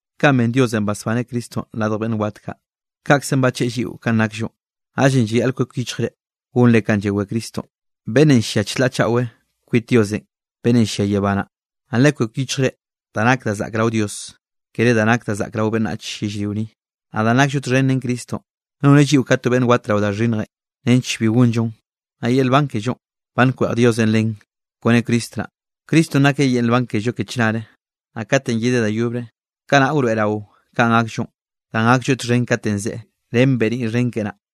Kanꞌ ben Diosenꞌ basbaneꞌ Cristonꞌ radj beꞌnn wat kaꞌ, kaꞌkzenꞌ bacheꞌe lliꞌo kanꞌ nakllonꞌ, naꞌllenꞌ llayaꞌl kwek yichjre gonre kanꞌ llawé Cristonꞌ, beꞌnnenꞌ llia chlaꞌ chaꞌwe kwit Diosenꞌ beꞌnnenꞌ llia yebá naꞌ. Naꞌ lekwek yichjre da nak da zaꞌk rao Dios, kere da nak da zaꞌk rao beꞌnnach yellrio ni. Naꞌ danꞌ nakllo txhen ren Cristonꞌ, noneꞌ lliꞌo ka to beꞌnn wat rao da xhinnjenꞌ nench bi gonllon, naꞌ yel nban kellonꞌ ba nkweꞌj Diosenꞌ len kone Cristo naꞌ. Cristonꞌ nakeꞌ yel nban kello ke chnare. Naꞌ katenꞌ yedeꞌ da yobre, kanaꞌ wroeꞌrao kanꞌ gakllo, danꞌ gaklloeꞌ txhen katenꞌ zeꞌe, ren beniꞌ xhen keꞌe naꞌ.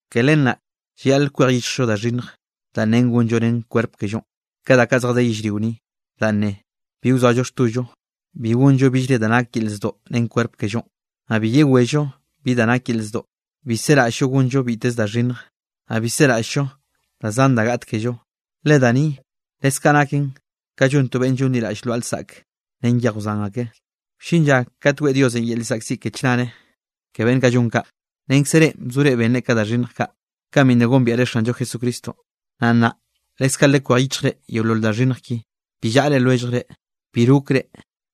Ke len naꞌ llayaꞌl kwej yichjllo da xhinnj danꞌ nen gonllo ren kwerp kellonꞌ, ka da kaꞌ zjadé rao yellrio ni, danꞌ ne: bi wzoallo xtollo, bi gonllo billre da nake yel zdoꞌ ren kwerp kellonꞌ, naꞌ bi yewello bi da nak yel zdoꞌ. Bi seraꞌll-llo gonllo biteze da xhinnj, naꞌ bi seraꞌll-llo da zan da gaꞌt kello, le da ni leskaꞌ naken ka llon to beꞌnn llonliraꞌll lwaꞌa lsaꞌke ren yej wzan ake. Wllin lla kate weꞌe Diosenꞌ yel llzaꞌkziꞌ ke chnare ke beꞌnn kaꞌ llon kaꞌ. Renkze reꞌ bzore benre ka da xhinnj kaꞌ, kanꞌ bi nna gombiaꞌre Xanllo Jesucristonꞌ. Naꞌ nnaꞌ leskaꞌ lekwej yichjre yeolol da xhinnj ki. Bi llaꞌre lwelljre, bi rokre,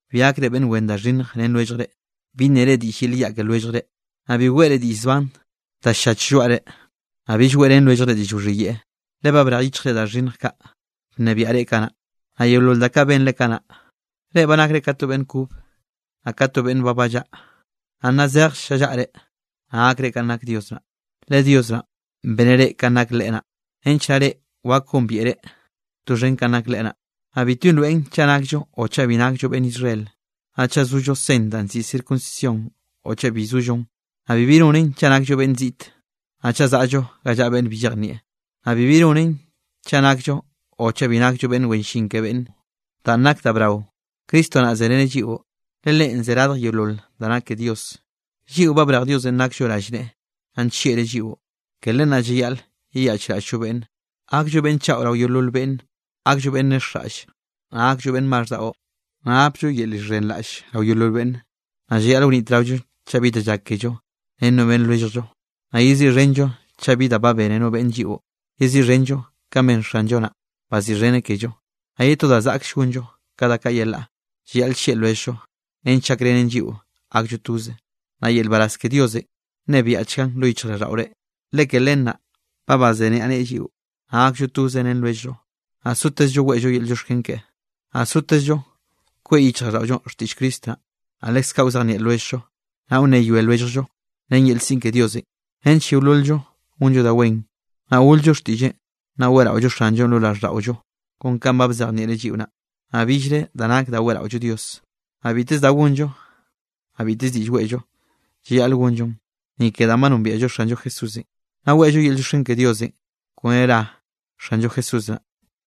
bi gakre beꞌnn wen da xhinnj ren lwelljre, bi nnere diꞌll yel yaꞌ ke lwelljre, naꞌ bi weꞌre diꞌll zban da ll-llach lloaꞌre. Naꞌ bill weꞌrén lwelljre diꞌll wxhiyeꞌe, le ba brej yichjre da xhinnj kaꞌ bnebiaꞌ reꞌ kanaꞌ, naꞌ yeolol da kaꞌ benre kanaꞌ. Reꞌ ba nakre ka to beꞌnn kob, naꞌ ka to beꞌnn ba ballaꞌa. Naꞌ nna zej llallaꞌre, naꞌ gakre kanꞌ nak Dios naꞌ, le Dios naꞌn beneꞌ reꞌ kanꞌ nak Leꞌe naꞌ, nench naꞌ reꞌ wak gombiaꞌre doxhen kanꞌ nak Leꞌe naꞌ. Naꞌ bitbi nroeꞌn chaꞌ nakllo o chaꞌ bi nakllo beꞌnn Israel, naꞌ chaꞌ zollo sen danꞌ nziꞌi circuncisión o chaꞌ bi zollon, naꞌ bibi nonen chaꞌ nakllo beꞌnn ziꞌt, naꞌ chaꞌ zaꞌllo ga llaꞌa beꞌnn bi llejnieꞌ, naꞌ bibi nonen chaꞌ nakllo o chaꞌ bi nakllo beꞌnn wen llin ke beꞌnne. Danꞌ nak da brao, Cristo naꞌ zereneꞌ lliꞌo, le Leꞌen ze radj yeolol da nak ke Dios. Lliꞌo ba brej Diosenꞌ nakllo rallneꞌe naꞌ nllieꞌreꞌ lliꞌo. Ke len naꞌ llayaꞌl yeyaꞌchraꞌll-llo beꞌnne, gakllo beꞌnn chaꞌo rao yeolol beꞌnne. Gakllo beꞌnn nexjraꞌlle, naꞌ gakllo beꞌnn maxh daꞌo, naꞌ gapllo yel llxhenraꞌll rao yeolol beꞌnne. Naꞌ llayaꞌl wnitraollo chaꞌ bi da llak kello ren no beꞌnn lwelljllo, naꞌ yeziꞌxhenllo chaꞌ bi da ba bene no beꞌnne lliꞌo, yeziꞌxhenllo kanꞌ ben Xanllo naꞌ, baziꞌxheneꞌ kello. Naꞌ ye to danꞌ zaꞌkll gonllo ka da kaꞌ yelaꞌ, llayaꞌl llieꞌ lwelljllo nench gakrenen lliꞌo gakllo toze. Naꞌ yel nbaraz ke Diosenꞌ nnebiaꞌchgan lo yichjraꞌlldaꞌore, le ke len naꞌ ba bazeniaꞌneꞌe lliꞌo. Naꞌ gakllo toze ren lwelljllo, naꞌ sotezllo weꞌllo yel llioxken keꞌe. Naꞌ sotezllo kweꞌ yichjraꞌlldaꞌollo xtiꞌll Cristo naꞌ, naꞌ leskaꞌ wzejnieꞌ lwelljllo, naꞌ wnneyoe lwelljllo ren yel siꞌn ke Diosenꞌ, nench yeolol-llo gonllo da wen. Naꞌ gol-llo xtiꞌlleꞌn, naꞌ weꞌraollo Xanllonꞌ lo raꞌlldaꞌollo kon kanꞌ ba bzejnieꞌreꞌ lliꞌo naꞌ, naꞌ billre da nak da weꞌraollo Dios. Naꞌ biteze da gonllo, naꞌ biteze diꞌll weꞌllo, llayaꞌl gonllon, ni ke danꞌ ba nombiaꞌllo Xanllo Jesúsenꞌ, naꞌ weꞌllo yel llioxken ke Diosenꞌ kone ra Xanllo Jesús naꞌ.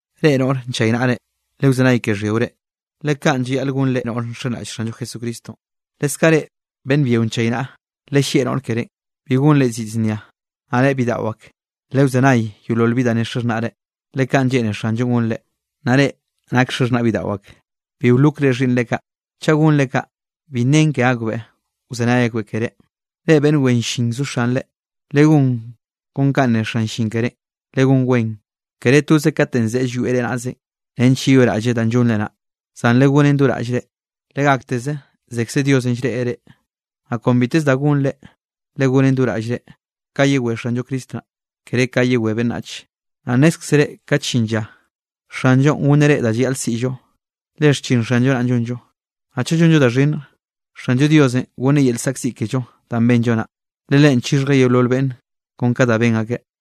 Reꞌ noꞌre nchaynaꞌre, lewzenay ke xhyiore, le kanꞌ llayaꞌl gon reꞌ noꞌr nxenraꞌll Xanllo Jesucristonꞌ. Leskaꞌ reꞌ beꞌnn byio nchaynaꞌa, lellieꞌ noꞌr kerénꞌ, bi gonreꞌ zid znia. Naꞌ reꞌ bidaꞌo ak, lewzenay yeolol bi da nne xaxhnaꞌre, le kaꞌn lleꞌne Xanllonꞌ gonre. Naꞌ reꞌ nake xaxhnaꞌ bidaꞌo ak, bi wlokre xhiꞌnnre kaꞌ. Chaꞌ gonre kaꞌ, bi nnen ke akbeꞌ wzenay akbeꞌ keré. Reꞌ beꞌnn wen llin zo xanre, legón kon kanꞌ ne xan llin kerénꞌ. Legonen wen, kere toz katenꞌ zeꞌe llwieꞌ reꞌ naꞌze, nench yeyoꞌraꞌlleꞌ danꞌ llonre naꞌ, zan legonen do raꞌllre, legákteze zekze Diosenꞌ llreꞌreꞌ reꞌ. Naꞌ kon biteze da gonre, legonen do raꞌllre ka yewé Xanllo Cristo naꞌ, kere ka yewé beꞌnnach. Naꞌ nnézkzere kat llin lla, Xanllonꞌ gonneꞌ reꞌ da llayaꞌl siꞌllo, le xchin Xanllo naꞌ llonllo. Naꞌ chaꞌ llonllo da xhinnj, Xanllo Diosenꞌ gonneꞌ yel zaꞌkziꞌ kello danꞌ benllo naꞌ. Le Leꞌen chixhjeꞌ yeolol beꞌnn kon ka da ben akeꞌ.